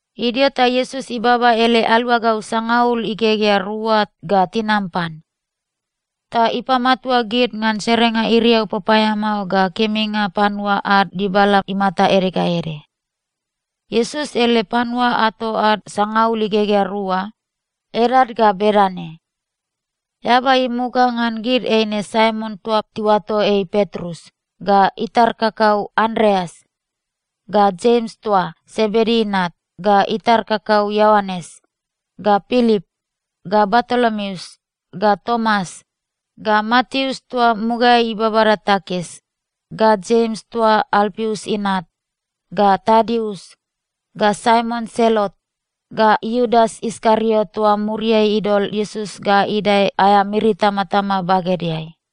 Idio ta Iesus ibaba ele aluagau sangaul igegea rua ga tinam pan. Ta ipamatua gid ngan serenga iriau papaeamao ga keminga panua ad dibala imata ede ga ede. Iesus ele panua ato ad sangaul igegea rua, edad ga bedane: eaba imuga ngan gid eine Saimon toa tiuato ei Petrus, ga itar kakau Andreas, ga Jems toa Sebedi inat, ga itar kakau Ioanes, ga Pilip, ga Bartolomeus, ga Tomas, ga Mateus toa mugaeai ibabada takis, ga Jems toa Alpius inat, ga Tadius, ga Saimon Selot, ga Iudas Iskariot toa muriai idol Iesus ga idae aea miri itamatama bagedeai.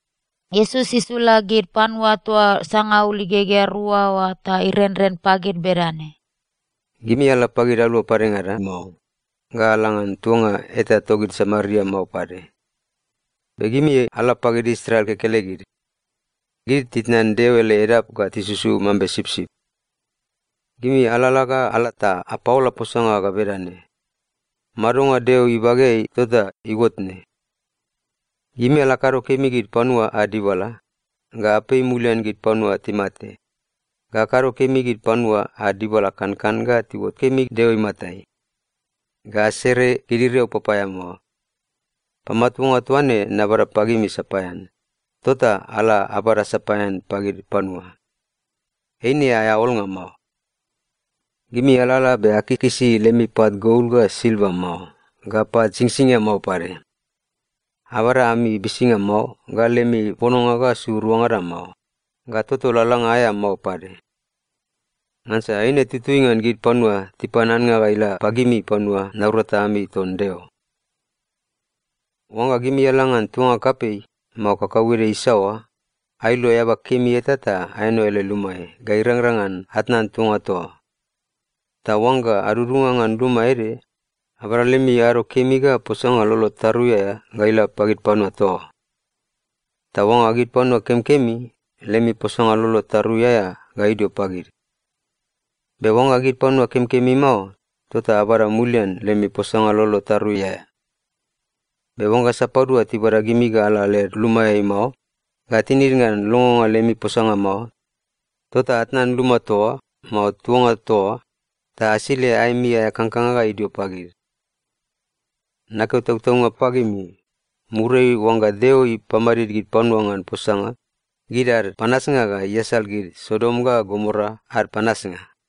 Iesus isula gid panua toa sangaul igegea rua oa ta irenren pagid bedane, “Gimi ala pagid alu padengada mao, ga ala ngan tuanga eta togid Samaria mao pade. Be gimi ala pagid Israel kekelegid. Gid titnan Deo ele edap ga tisusu mambe sipsip. Gimi alalala ga ala ta apaola posanga ga bedane, ‘Madonga Deo ibageai tota iuot ne.’ Gimi ala akado kemi gid panua ad dibala, ga apei mulian gid panua timate, ga akado kemi gid panua ad dibala kankan ga tiuot kemi Deo imatai, ga asere gid iriau papaeamao. Pamatuanga toa ne nabada pagimi sapaean, tota ala abada sapaean pagid panua. Eine aea olnga mao. Gimi alalala be akikisi lemi pat gol ga silva mao, ga pat singsingia mao pade. Abada ami bisinga mao, ga lemi pononga ga su ruangada mao, ga toto lalalanga aea mao pade. Ngansa eine tutui ngan gid panua tipan annga ga ila pagimi panua naurata ami ton Deo. “Oangga gimi ala ngan tuanga kapei, mao kakauede isaoa, ailo eaba kemi eta ta aeno ele lumaeai ga irangrang ngan atnan tuanga toa oa. Ta oangga adudunga ngan luma ede, abada lemi ado kemi ga posanga lolo tarui aea ga ila pagid panua toa oa. Ta oangga gid panua kemikemi, lemi posanga lolo tarui aea ga idio pagid. Be oangga gid panua kemikemi mao, tota abada mulian lemi posanga lolo tarui aea. Be oangga sapadua tibada gimi ga ala led lumaeai mao, ga tinid ngan longonga lemi posanga mao, tota atnan luma toa oa, mao tuanga toa oa, ta asile aemi aea kangkanga ga idio pagid. Nakeo tautaunga pagimi, muriai oangga Deo ipamadid gid panua ngan posanga, gid ad panasnga ga iasal gid Sodom ga Gomora ad panasnga.”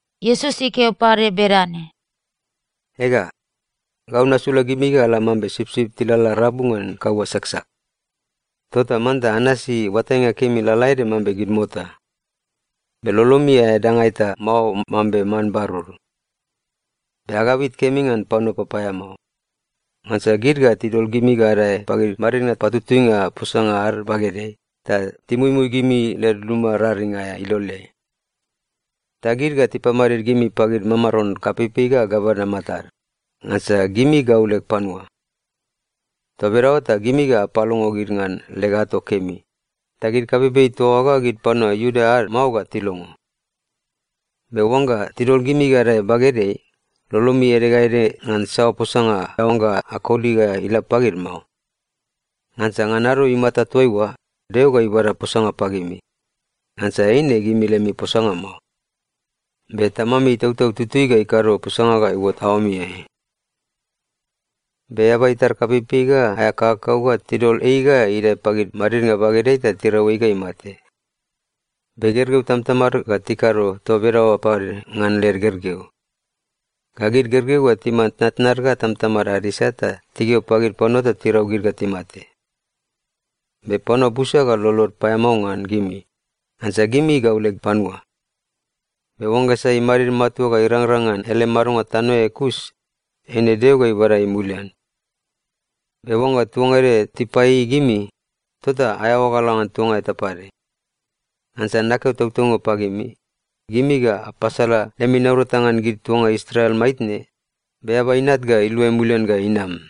Iesus ikeo pade bedane, “Ega, gau nasula gimi ga ala mambe sipsip tilalala rabu ngan kaua saksak. Tota manta anasi oatainga kemi lalaede mambe gid mota, be lolomi aea danga eta mao mambe man barur. Be agabit kemi ngan panua papaeamao. Ngansa gid ga tidol gimi ga adae pagid madidnga patutuinga posanga ad bagedeai ta timuimui gimi led luma raring aea iloleai. Ta gid ga tipamadid gimi pagid mamaron kapeipei ga gavana matad, ngansa gimi gau leg panua. Toa bedaoa ta gimi ga apalongo gid ngan leg ato kemi, ta gid kapeipei toa oa ga gid panua Iuda ad mao ga tilongo. Be oangga tidol gimi ga adae bagedeai, lolomi ede ga ede ngan saoa posanga aoangga akoli ga ila pagid mao. Ngansa ngan ado imata toaiua, Deo ga ibada posanga pagimi. Ngansa eine gimi lemi posanga mao, be Tamami Itautau Tutui ga ikado posanga ga iuot aoamiai. “Be eaba itar kapeipei ga aea kakakau ga tidol ei ga idae pagid madidnga bagedeai ta tirau ei ga imate. Be gergeu tamatamad ga tikado toa bedaoa pade ngan led gergeu. Ga gid gergeu ga timan tnatnad ga tamatamad ad isat ta tikeo pagid panua ta tirau gid ga timate. Be panua busa ga lolod paeamao ngan gimi, ngansa gimi gau leg panua. Be oangga sai imadid matua ga irangrang ngan ele madonga tanoeai kus, eine Deo ga ibada ei mulian. Be oangga tuanga ede tipaieiei gimi, tota aeaoa ga ala ngan tuanga eta pade. Ngansa nakeo tautaunga pagimi, gimi ga apasala lemi naurata ngan gid tuanga Israel maitne, be Eaba Inat ga iluai mulian ga inam.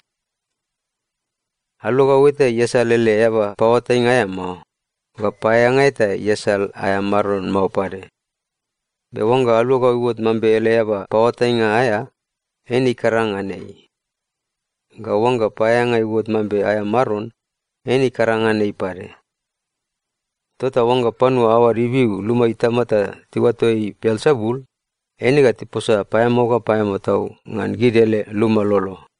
“Aluagau eta iasal ele eaba paoatainga aea mao, ga paeaeanga eta iasal aea maron mao pade. Be oangga aluagau iuot mambe ele eaba paoatainga aea, eine ikaranga ngan ei. Ga oangga paeaeanga iuot mambe aea maron, eine ikaranga ngan ei pade. Tota oangga panua aoad ibiu luma itama ta tiuato ei Belsebul, eine ga tiposa paeamao ga paeamao tau ngan gid ele luma lolo.”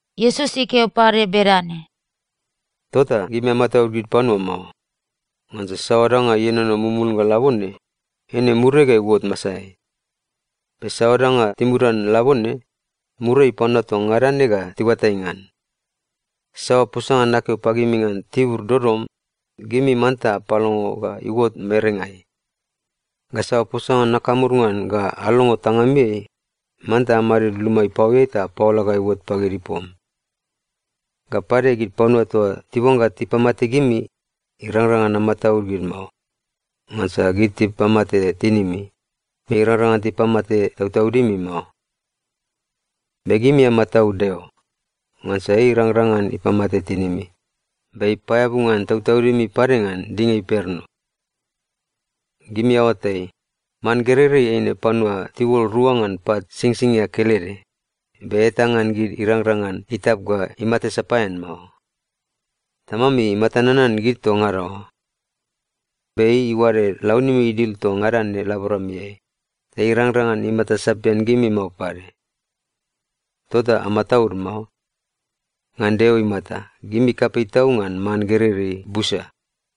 Iesus ikeo pade bedane, “Tota gimi amataud gid panua mao. Ngansa saoa danga ienono mumulnga labone, eine muriai ga iuot masaeai. Be saoa danga timudan labone, muriai panua toa ngada ne ga tiuatai ngan. Saoa posanga nakeo pagimi ngan tibur dodom, gimi manta apalongo ga iuot merengai. Ga saoa posanga nakamur ngan ga alongo tangamiai, manta amadid luma ipaoeai ta apaola ga iuot pagid ipom. Ga pade, gid panua toa tiuangga tipamate gimi, irangrang ngan amataud gid mao. Ngansa gid tipamate tinimi, be irangrang ngan tipamate tautaudimi mao. Be gimi amataud Deo. Ngansa ei irangrang ngan ipamate tinimi, be ipaeabu ngan tautaudimi pade ngan dinga imperno. Gimi aoatai, man gereirei eine panua tiuol rua ngan pat singsingia kelede, be eta ngan gid irangrang ngan itap ga imate sapaean mao. Tamami imata nanan gid toa ngada oa. Be ei iuade launimi idil toa ngada ne laboramiai, ta irangrang ngan imata sapian gimi mao pade. Tota amataud mao. Ngan Deo imata, gimi kapei tau ngan man gereirei busa.”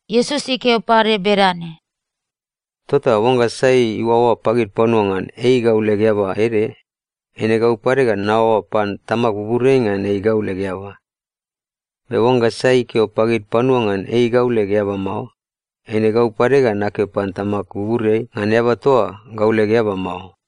Iesus ikeo pade bedane, “Tota oangga sai iuaoa pagid panua ngan ei gau leg eaba ede, eine gau pade ga naoaoa pan Tamag buburiai ngan ei gau leg eaba. Be oangga sai ikeo pagid panua ngan ei gau leg eaba mao, eine gau pade ga nakeo pan Tamag buburiai ngan eaba toa oa gau leg eaba mao.”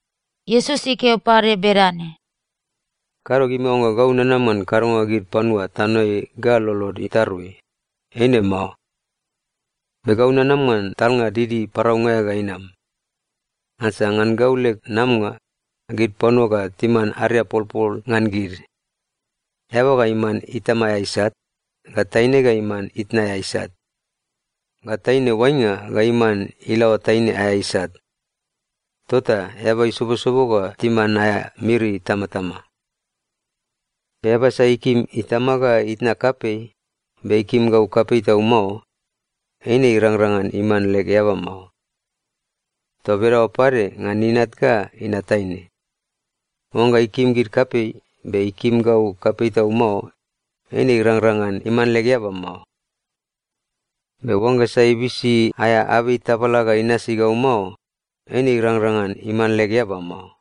Iesus ikeo pade bedane, “Kado gimi aoangga gau nanam ngan kadonga gid panua tanoeai ga lolod itarui. Eine mao. Be gau nanam ngan talnga didi paraunga aea ga inam! Ngansa ngan gau leg namanga, gid panua ga timan ariapolpol ngan gid. “‘Eaba ga iman itama aea isat, ga taine ga iman itna aea isat, ga taine oainga ga iman ilaoa taine aea isat. Tota eaba isobosobo ga timan aea miri itamatama.’ “Eaba sai ikim itama ga itna kapei, be ikim gau kapei tau mao, eine irangrang ngan iman leg eaba mao. Toa bedaoa pade ngan inat ga inat taine, oangga ikim gid kapei, be ikim gau kapei tau mao, eine irangrang ngan iman leg eaba mao. Be oangga sai ibisi aea abei tabala ga inasi gau mao, eine irangrang ngan iman leg eaba mao.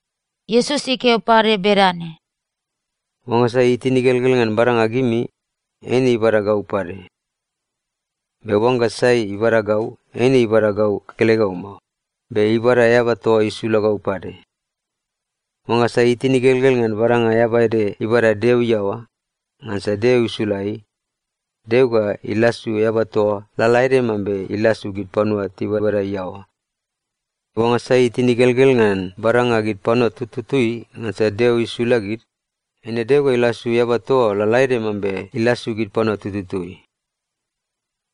Iesus ikeo pade bedane, “Oangga sai itin igelgel ngan badanga gimi, eine ibada gau pade. Be oangga sai ibada gau, eine ibada gau kekelegau mao, be ibada eaba toa isula gau pade. Oangga sai itin igelgel ngan badanga eaba ede ibada Deo iaoa, ngansa Deo isula ei, Deo ga ilasu eaba toa oa lalaede mambe ilasu gid panua tibabada iaoa. Be oangga sai itin igelgel ngan badanga gid panua tututui, ngansa Deo isula gid, eine Deo ga ilasu eaba toa oa lalaede mambe ilasu gid panua tututui.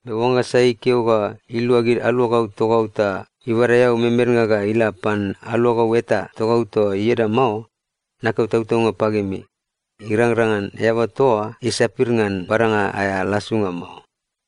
Be oangga sai ikeo ga ilua gid aluagau togau ta ibada eau memednga ga ila pan aluagau eta togau toa ieda mao, nakeo tautaunga pagimi, irangrang ngan eaba toa oa isapir ngan badanga aea lasunga mao.”